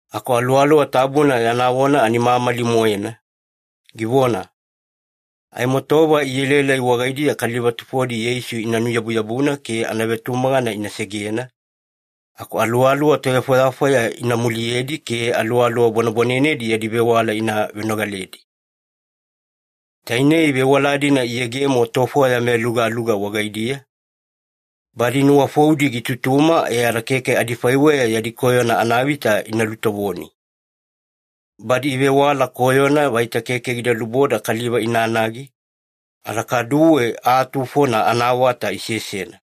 Aku Aluwaluwa Tabuna yana vona ani mamali-moena, givona, “Aimo tova ielaelai wagaidiya kaliva tufodi Yeisu ina nuyabuyabuna ke anavetumagana ina segena, aku aluwaluwa tovefwayafwaya ina muliyedi ke aluwaluwa bwanebwanenedi yadi vewala ina venogaledi.” Tainei vewala-dina iyegemo tofwaya meyalugaluga wagaidiya, badi nuwafoudi gitutuma e ada keke adifaiweya yadi koyona anavita ina lutovoni. Badi ivewala koyona vaita keke gida luboda kaliva inanagi, ada kaduwe aa tufona anaawata isesena.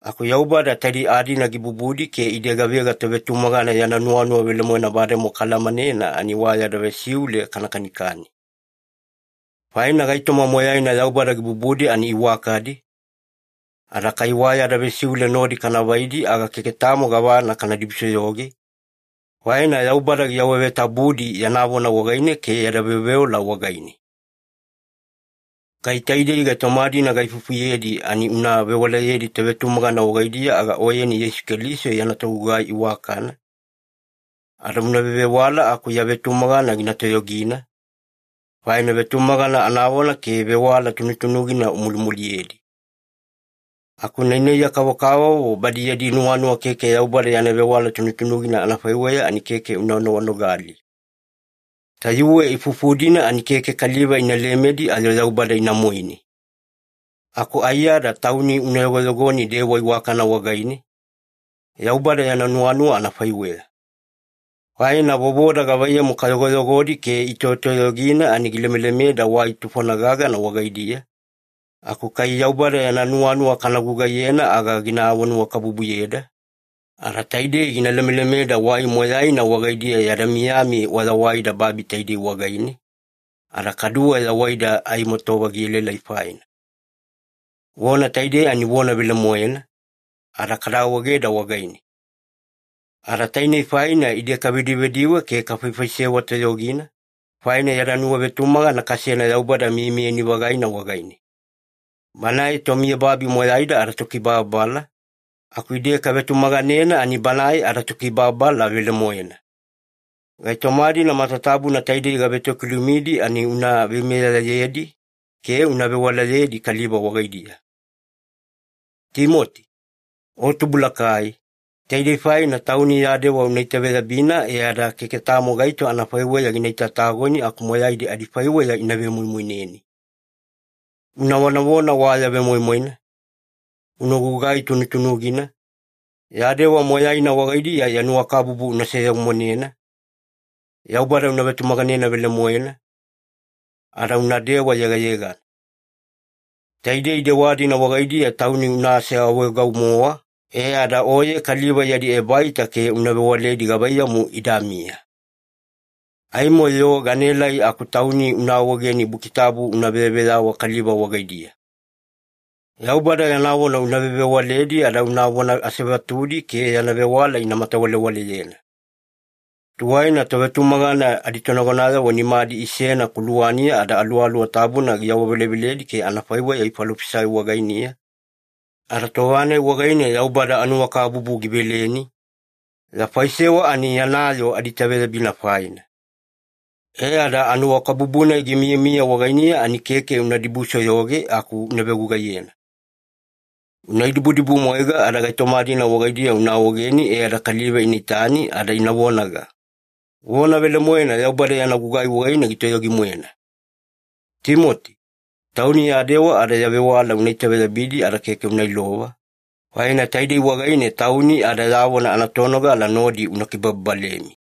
Aku Yaubada taidei aa-dina gibubudi ke ide gavega tovetumagana yana nuwanuwa velemoena bademowa kaalamanena ani wa yada vesiule kana kanikani. Faina gaitoma moyaina Yaubada gibubudi ani iwakadi, ada kai wa yada vesiule nodi kana vaidi aga keke tamo gavana kana dibusoyoge, faina Yaubada giawavetabudi yana vona wagaine ke yada veoveola wagaine. Kai taidei gaitoma-dina gaifufuyedi ani una vewalayedi tovetumagana wagaidiya aga oyeni Yeisu Keliso yana togugai iwakana, ada una vevewala aku ya vetumagana gina toyogina, faina vetumagana anavona ke vewala tunutunugina umulimuliyedi. Aku nainaiya kavokavovo badi yadi nuwanuwa keke Yaubada yana vewala tunutunugina anafaiweya ani keke una noganogali. Tayuwe ifuifufu-dina ani keke kaliva ina lemedi ayo Yaubada ina moine. Aku aiyada tauni una yogoyogoni dewa iwakana wagaine, Yaubada yana nuwanuwa anafaiweya. Faina vovoda gavaiyamu kayogoyogodi ke itoyotoyogina ani gilemelemeda wai tufona gagana wagaidiya, aku kai Yaubada yana nuwanuwa kana gugaiyena aga gina awanuwakabubuyeda, ada taidei gina lemelemeda wai moyaina wagaidiya yada miyami wayawaida babi taidei wagaine, ada kaduwe yawaida aimo tova gielaelai faina. Vona taidei ani vona velemoena, ada kada awaegeda wagaine. Ada tainei faina ide kavedivediwe ke kafaifaisewa toyogina, faina yada nuwavetumagana kasena Yaubada miyamiyani-vagaina wagaine. Banae tomiyababi moyaida adaTokibababala, aku ide kavetumaganena ani Banae adaTokibababala velemoena. Gaitoma-dina matatabuna taidei gavetokilumidi ani una veimeyayedi ke una vewalayedi kaliva wagaidiya. Timoti, o tubulakai, taidei faina tauni ya dewa una itaveyabina e ada keke tamo gaito anafaiweya gina itatagoni aku moyaidi adifaiweya ina vemoimoineni. Una vonavona wa ya vemoimoina, una gugai tunutunugina, ya dewa moyaina wagaidiya ya nuwakabubu una seyegemonena, Yaubada una vetumaganena velemoena, ada unadewa yegayegana. Taidei dewa-dina wagaidiya tauni una aseawaegau-mowa e ada oye kaliva yadi ebaita ke una vewaledi gavaiyamu idamiya. Aimo-yo ganaelai aku tauni una awaegeni Buki Tabu una veyaveyawa kaliva wagaidiya. Yaubada yana vona una vevewaledi ada unavona asevatudi ke yana vewala ina matawalewaleyena. Tuwaina tovetumagana aditonagonayavo nimadi isena kuluwaniya ada Aluwaluwa Tabuna giawaveleveledi ke anafaiweya ifalofisai wagainiya, ada tova-nai wagaine Yaubada anuwakabubu giveleni, ya faisewa ani yana yoo adiitaveyabina faina. E ada anuwakabubu-nai gimiyamiya wagainiya ani keke una dibusoyoge aku una vegugaiyena. Una idibudibumwaiga ada gaitoma-dina wagaidiya una awaegeni e ada kaliva ina itani ada ina vonaga, “Vona velemoena Yaubada yana gugai wagaine gitoyogi-moena.” Timoti, tauni ya dewa ada ya vewala una itaveyabidi ada keke una ilova, faina taidei wagaine tauni ada ya vona anatonogala nodi una kibababalemi.